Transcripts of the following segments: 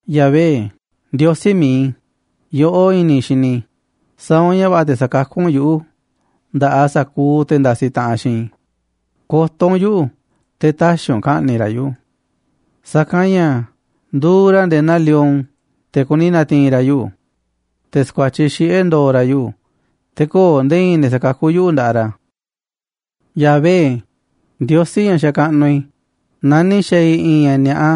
Yahvé, Ndiosí mi̱iꞌ i̱, yoꞌó i̱ni̱ i̱ xini i̱, sa̱a̱ u̱nꞌ ña̱ va̱ꞌa̱ te̱ sa̱kakú u̱nꞌ yuꞌu̱ nda̱ꞌaꞌ sa̱kuuꞌ te̱ ndasiꞌ taꞌanꞌ xiinꞌ i̱, ko̱to̱ u̱nꞌ yuꞌu̱ te̱ tä̱xi̱ u̱nꞌ ka̱ꞌni̱ꞌ ra̱ yuꞌu̱. Sa̱kanꞌ ña̱ nduuꞌ ra̱ nde̱e̱ naa lion, te̱ kuni na̱ti̱i̱n ra̱ yuꞌu̱, te̱ sa̱kuatyiꞌ xiꞌe̱ ndo̱o̱ ra̱ yuꞌu̱, te̱ köo̱ꞌ nde̱e̱ i̱i̱n ne̱ sa̱kakú yuꞌu̱ nda̱ꞌaꞌ ra̱. Yahvé, Ndiosí ña̱ xakaꞌnuꞌ i̱, naaꞌ ni̱ xa̱a̱ i̱ i̱i̱n ña̱ ni̱a̱ꞌa,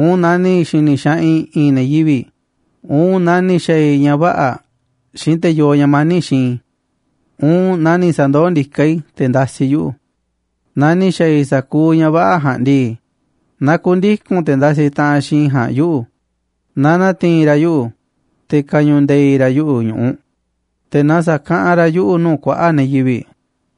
uun naaꞌ ni̱ xi̱ni̱ xaꞌanꞌ i̱ i̱i̱n ne̱ yivi̱ꞌ, uun naaꞌ ni̱ xa̱a̱ i̱ ña̱ vä̱ꞌa̱ xiinꞌ te̱ yoo ña̱ mani̱ꞌ xiinꞌ i̱, uun naaꞌ ni̱ sa̱ndoó ndiká i̱ te̱ ndasiꞌ yuꞌu̱, naaꞌ ni̱ xa̱a̱ i̱ sa̱kuuꞌ ña̱ vä̱ꞌa̱ ja̱a̱nꞌ ndii, na ku̱ndiku̱n te̱ ndasiꞌ taꞌanꞌ xiinꞌ i̱ ja̱a̱nꞌ yuꞌu̱, na na̱ti̱i̱n ra̱ yuꞌu̱, te̱ ka̱ñu̱u̱ nde̱i̱ ra̱ yuꞌu̱ ñu̱ꞌuꞌ, te̱ na sa̱kaꞌanꞌ ra̱ yuꞌu̱ nuu̱ꞌ kuaꞌa̱ꞌ ne̱ yivi̱ꞌ.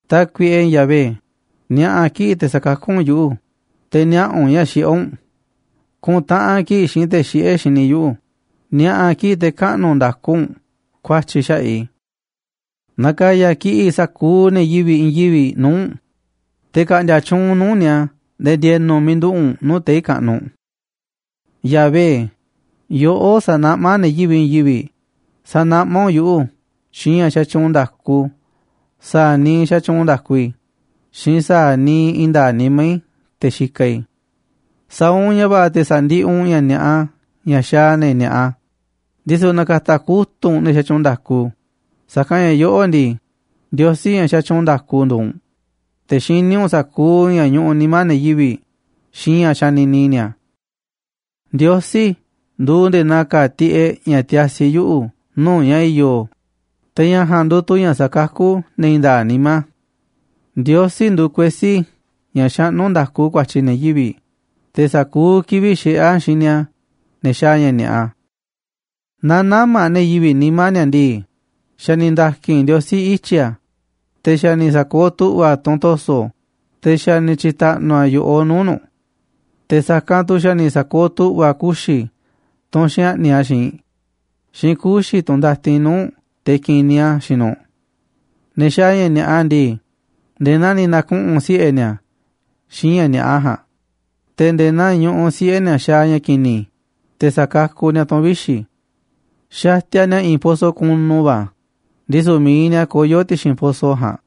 Tákuiꞌe Yahvé, ni̱a̱ꞌa̱ kiꞌi̱ꞌ te̱ sa̱kakú u̱nꞌ yuꞌu̱, te̱ niaꞌa̱ u̱nꞌ ña̱ xiꞌé u̱nꞌ, ku̱ntaꞌanꞌ kiꞌi̱ꞌ xiinꞌ te̱ xiꞌé xini yuꞌu̱, ni̱a̱ꞌa̱ kiꞌi̱ꞌ te̱ kaꞌnu̱ nda̱ku u̱nꞌ ku̱a̱tyi̱ xaꞌa̱ꞌ i̱. Na̱ka̱ya̱ kiꞌi̱ꞌ sa̱kuuꞌ ne̱ yivi̱ꞌ i̱i̱n yivi̱ꞌ nuu̱ꞌ u̱nꞌ, te̱ ka̱ꞌndi̱a̱ tyuunꞌ u̱nꞌ nuu̱ꞌ ni̱a̱ nde̱e̱ ndi̱e̱nu̱ miiꞌ nduꞌu̱ꞌ u̱nꞌ nuu̱ꞌ tei̱ kaꞌnuꞌ. Yahvé, yoꞌó sanaꞌmá ne̱ yivi̱ꞌ i̱i̱n yivi̱ꞌ, sa̱naꞌmá u̱nꞌ yuꞌu̱ xiinꞌ ña̱ xatyuunꞌ nda̱ku sa̱a̱ niiꞌ xatyuunꞌ nda̱ku i̱ xiinꞌ sa̱a̱ niiꞌ i̱i̱n nda̱a̱ꞌ nimá i̱ te̱ xikaꞌ i̱. Sa̱a̱ u̱nꞌ ña̱ va̱ꞌa̱ te̱ sa̱ndiꞌiꞌ u̱nꞌ ña̱ ni̱a̱ꞌa ña̱ xaaꞌ ne̱ ni̱a̱ꞌa, ndisu̱ na̱ka̱ta̱ kutu̱ꞌ u̱nꞌ ne̱ xatyuunꞌ nda̱ku, sa̱kanꞌ ña̱ yoꞌó ndii, Ndiosí ña̱ xatyuunꞌ nda̱ku nduuꞌ u̱nꞌ, te̱ xiní u̱nꞌ sa̱kuuꞌ ña̱ ñuꞌuꞌ nimá ne̱ yivi̱ꞌ xiinꞌ ña̱ xanini ni̱a̱. Ndiosí nduuꞌ nde̱e̱ naa ka̱a̱ tiꞌeꞌ ña̱ tiasi yuꞌu̱ nuu̱ꞌ ña̱ i̱yo̱, te̱ ña̱ ja̱a̱nꞌ nduuꞌ tu̱ ña̱ sakakú ne̱ i̱i̱n nda̱a̱ꞌ nimá. Ndiosí nduuꞌ kuesí ña̱ xaꞌnú nda̱ku ku̱a̱tyi̱ ne̱ yivi̱ꞌ, te̱ sa̱kuuꞌ kivi̱ꞌ xiꞌé a̱ xini a̱ ne̱ xaaꞌ ña̱ ni̱a̱ꞌa. Naaꞌ nä̱ma̱ ne̱ yivi̱ꞌ nimá ni̱a̱ ndii, xa̱ ni̱ nda̱ki̱n Ndiosí ityi̱ a̱, te̱ xa̱ ni̱ sa̱kooꞌ tu̱ꞌva̱ a̱ tunꞌ to̱so̱, te̱ xa̱ ni̱ tyi̱ta̱ꞌnu̱ a̱ yo̱ꞌoꞌ nuu̱ꞌ nu̱ꞌ. Te̱ sa̱kanꞌ tu̱ xa̱ ni̱ sa̱kooꞌ tu̱ꞌva̱ a̱ kuxi̱, tunꞌ xaꞌni̱ꞌ a̱ xiinꞌ, xiinꞌ kuxi̱, tunꞌ ndatin nuu̱ꞌ te̱ ki̱niꞌ a̱ xiinꞌ nu̱ꞌ. Ne̱ xaaꞌ ña̱ ni̱a̱ꞌa ndii, nde̱e̱ naa ni̱ na̱kuꞌu̱n siꞌe̱ ni̱a̱ xiinꞌ ña̱ ni̱a̱ꞌa ja̱a̱nꞌ, te̱ nde̱e̱ naa ñuꞌuꞌ siꞌe̱ ni̱a̱ xaaꞌ ña̱ ki̱ni̱, te̱ sa̱kakuꞌ ni̱a̱ tu̱n vixi̱. Xatiaꞌ ni̱a̱ i̱i̱n poso̱ kunu va̱, ndisu̱ mi̱iꞌ ni̱a̱ koyó ti̱xi̱n poso̱ ja̱a̱nꞌ.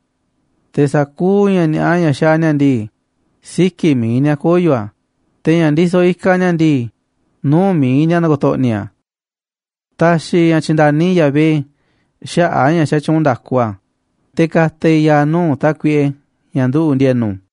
Te̱ sa̱kuuꞌ ña̱ ni̱a̱ꞌa ña̱ xaaꞌ ni̱a̱ ndii, siki̱ꞌ mi̱iꞌ ni̱a̱ koyo̱ a̱, te̱ ña̱ ndisoꞌ ikaꞌ ni̱a̱ ndii, nuu̱ꞌ mi̱iꞌ ni̱a̱ na̱ko̱to̱ꞌni̱ a̱. Ta̱xi̱ i̱ ña̱ tyi̱nda̱ni Yahvé xaꞌa̱ꞌ a̱ ña̱ xatyuunꞌ nda̱ku a̱, te̱ ka̱ta̱ i̱ ya̱a̱ nuu̱ꞌ Tákuiꞌe, ña̱ nduꞌu̱ꞌ ndi̱e̱nu̱.